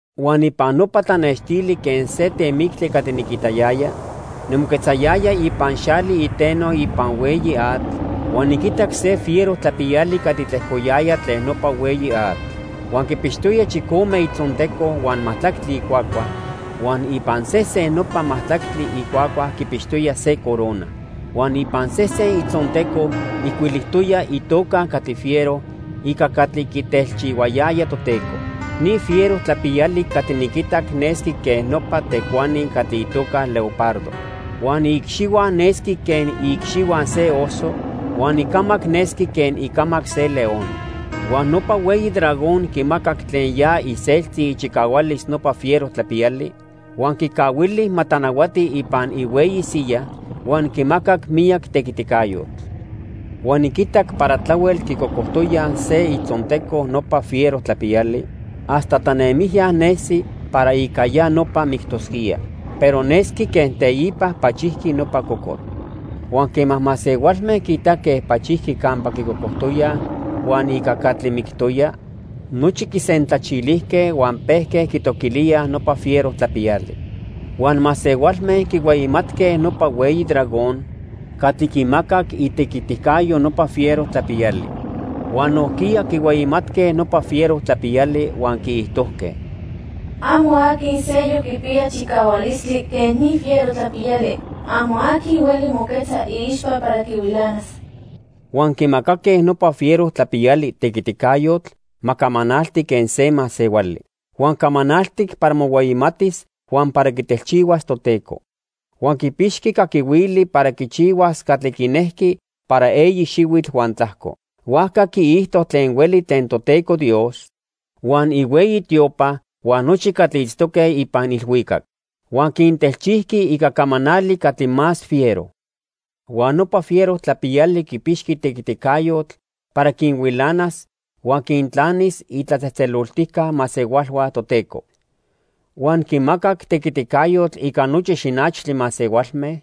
Huan ipan nopa tlanextili quen se temictli catli niquitayaya, nimoquetzayaya ipan xali iteno ipan hueyi atl huan niquitac se fiero tlapiyali catli tlejcoyaya tlen nopa hueyi atl. Huan quipixtoya chicome itzonteco huan majtlactli icuacua huan ipan sesen nopa majtlactli icuacua quipixtoya se corona. Huan ipan sesen itzonteco ijcuilijtoya itoca catli fiero ica catli quitelchihuayaya Toteco. Ni fiero tlapiyali catli niquitac nesqui quen nopa tecuani catli itoca leopardo. Huan iicxihua nesqui quen iicxihua se oso, huan icamac nesqui quen icamac se león. Huan nopa hueyi dragón quimacac tlen ya iseltzi ichicahualis nopa fiero tlapiyali, huan quicahuili ma tlanahuati ipan ihueyi siya huan quimacac miyac tequiticayotl. Huan niquitac para tlahuel quicocojtoyaj se itzonteco nopa fiero tlapiyali hasta tlanemijya nesi para ica ya nopa mictosquía. Pero nesqui quen teipa pachijqui nopa cocotl. Huan quema masehualme quiitaque pachijqui campa quicocojtoyaj huan ica catli mictoya, nochi quisentlachilijque huan pejque quitoquilíaj nopa fiero tlapiyali. Huan masehualme quihueyimatque nopa hueyi dragón catli quimacac itequiticayo nopa fiero tlapiyali. Huan nojquiya quihueyimatque nopa fiero tlapiyali huan quiijtojque: "Amo aqui seyoc quipiya chicahualistli quen ni fiero tlapiyali. Amo aqui hueli moquetza iixpa para quihuilanas." Huan quimacaque nopa fiero tlapiyali tequiticayotl ma camanalti quen se masehuali. Huan camanaltic para mohueyimatis huan para quitelchihuas Toteco. Huan quipixqui caquihuili para quichihuas catli quinejqui para eyi xihuitl huan tlajco. Huajca quiijto tlen hueli tlen Toteco Dios, huan ihueyi tiopa huan nochi catli itztoque ipan ilhuicac. Huan quintelchijqui ica camanali catli más fiero. Huan nopa fiero tlapiyali quipixqui tequiticayotl para quinhuilanas huan quintlanis itlatzejtzeloltijca masehualhua Toteco. Huan quimacac tequiticayotl ica nochi xinachtli masehualme,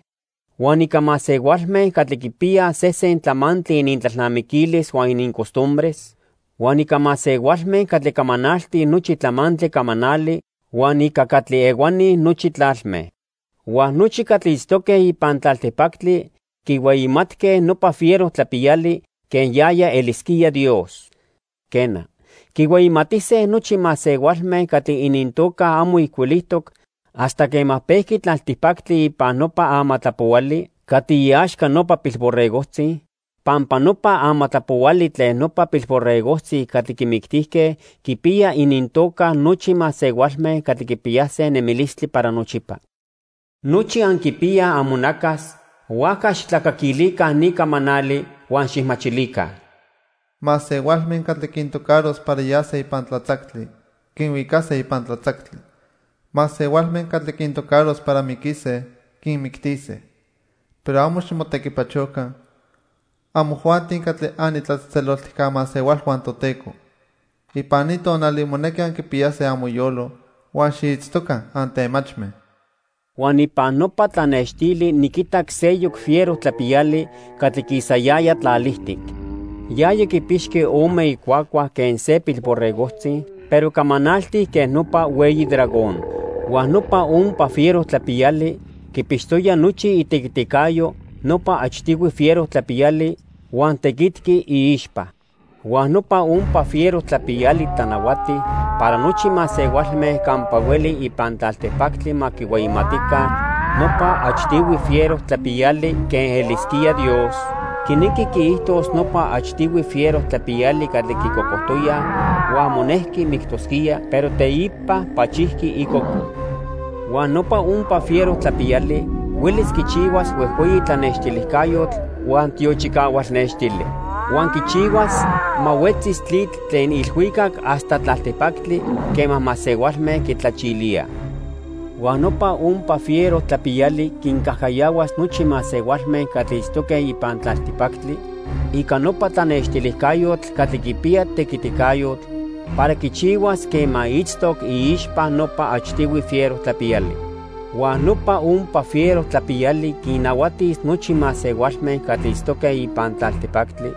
huan ica masehualme catli quipiyaj sesen tlamantli inintlalnamiquilis huan inincostumbres, huan ica masehualme catli camanaltij nochi tlamantli camanali huan ica catli ehuani nochi tlalme. Huan nochi catli itztoque ipan tlaltipactli quihueyimatque nopa fiero tlapiyali quen yaya elisquía Dios. Quena, quihueyimatise nochi masehualme catli inintoca amo ijcuilijtoc hasta quema pejqui tlaltipactli ipan nopa amatlapohuali catli iaxca nopa Pilborregojtzi, pampa nopa Amatlapohuali Tlen Nopa Pilborregojtzi Catli Quimictijque quipiya inintoca nochi masehualme catli quipiyase nemilistli para nochipa. Nochi anquipiyaj amonacas, huajca xijtlacaquilica ni camanali huan xijmachilica: "Masehualme catli quintocaros para yase ipan tlatzactli, quinhuicase ipan tlatzactli. Masehualme catli quintocaros para miquise, quinmictise. Pero amo ximotequipachoca, amojuanti catli anitlatzejtzeloltijca masehualhua Toteco. Ipan ni tonali monequi anquipiyase amoyolo huan xiitztoca antemachme." Huan ipan nopa tlanextili niquitac seyoc fiero tlapiyali catli quisayaya tlalijtic. Yaya quipixqui ome icuacua quen se pilborregojtzi, pero camanaltic quen nopa hueyi dragón. Huan nopa ompa fiero tlapiyali quipixtoya nochi itequiticayo nopa achtihui fiero tlapiyali huan tequitqui iixpa. Huan nopa ompa fiero tlapiyali tlanahuati para nochi masehualme campa hueli ipan tlaltipactli ma quihueyimatica nopa achtihui fiero tlapiyali quen elisquía Dios, quinequi quiijtos nopa achtihui fiero tlapiyali catli quicocojtoyaj huan monejqui mictosquía, pero teipa pachijqui icoco. Huan nopa ompa fiero tlapiyali huelis quichihuas huejhueyi tlanextilijcayotl huan tiochicahual nextili. Huan quichihuas ma huetzis tlitl tlen ilhuicac hasta tlaltipactli quema masehualme quitlachilíaj. Huan nopa ompa fiero tlapiyali quincajcayahuas nochi masehualme catli itztoque ipan tlaltipactli ica nopa tlanextilijcayotl catli quipiya tequiticayotl para quichihuas quema itztoc iixpa nopa achtihui fiero tlapiyali. Huan nopa ompa fiero tlapiyali quinnahuatis nochi masehualme catli itztoque ipan tlaltipactli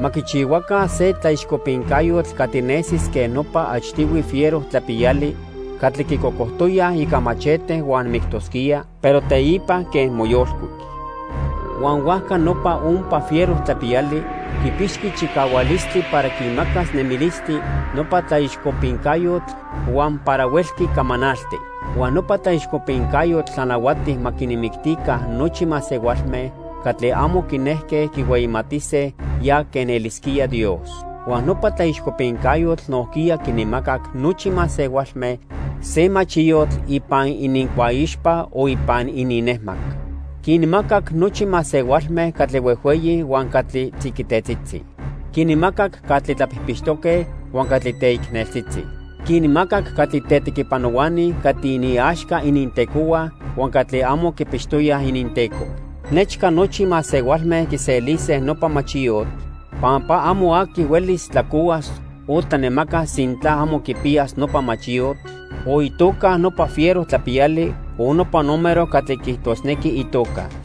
ma quichihuaca se tlaixcopincayotl catli nesis quen nopa achtihui fiero tlapiyali catli quicocojtoyaj ica machete huan mictosquía, pero teipa quen moyolcuic. Huan huajca nopa ompa fiero tlapiyali quipixqui chicahualistli para quimacas nemilistli nopa tlaixcopincayotl huan para huelqui camanalti. Huan nopa tlaixcopincayotl tlanahuati ma quinmictica nochi masehualme catli amo quinejque quihueyimatise ya quen elisquía Dios. Huan nopa tlaixcopincayotl nojquiya quinmacac nochi masehualme se machiyotl ipan inincuaixpa o ipan ininnejmac. Quinmacac nochi masehualme catli huejhueyi huan catli tziquitetzitzi. Quinmacac catli tlapijpixtoque huan catli teicneltzitzi. Quinmacac catli tetequipanohuani catli iniaxca inintecohua huan catli amo quipixtoyaj ininteco. Nechca nochi masehualme quiselise nopa machiyotl, pampa amo aqui huelis tlacohuas o tlanemacas sintla amo quipiyas nopa machiyotl, o itoca nopa fiero tlapiyali o nopa número catli quiijtosnequi itoca.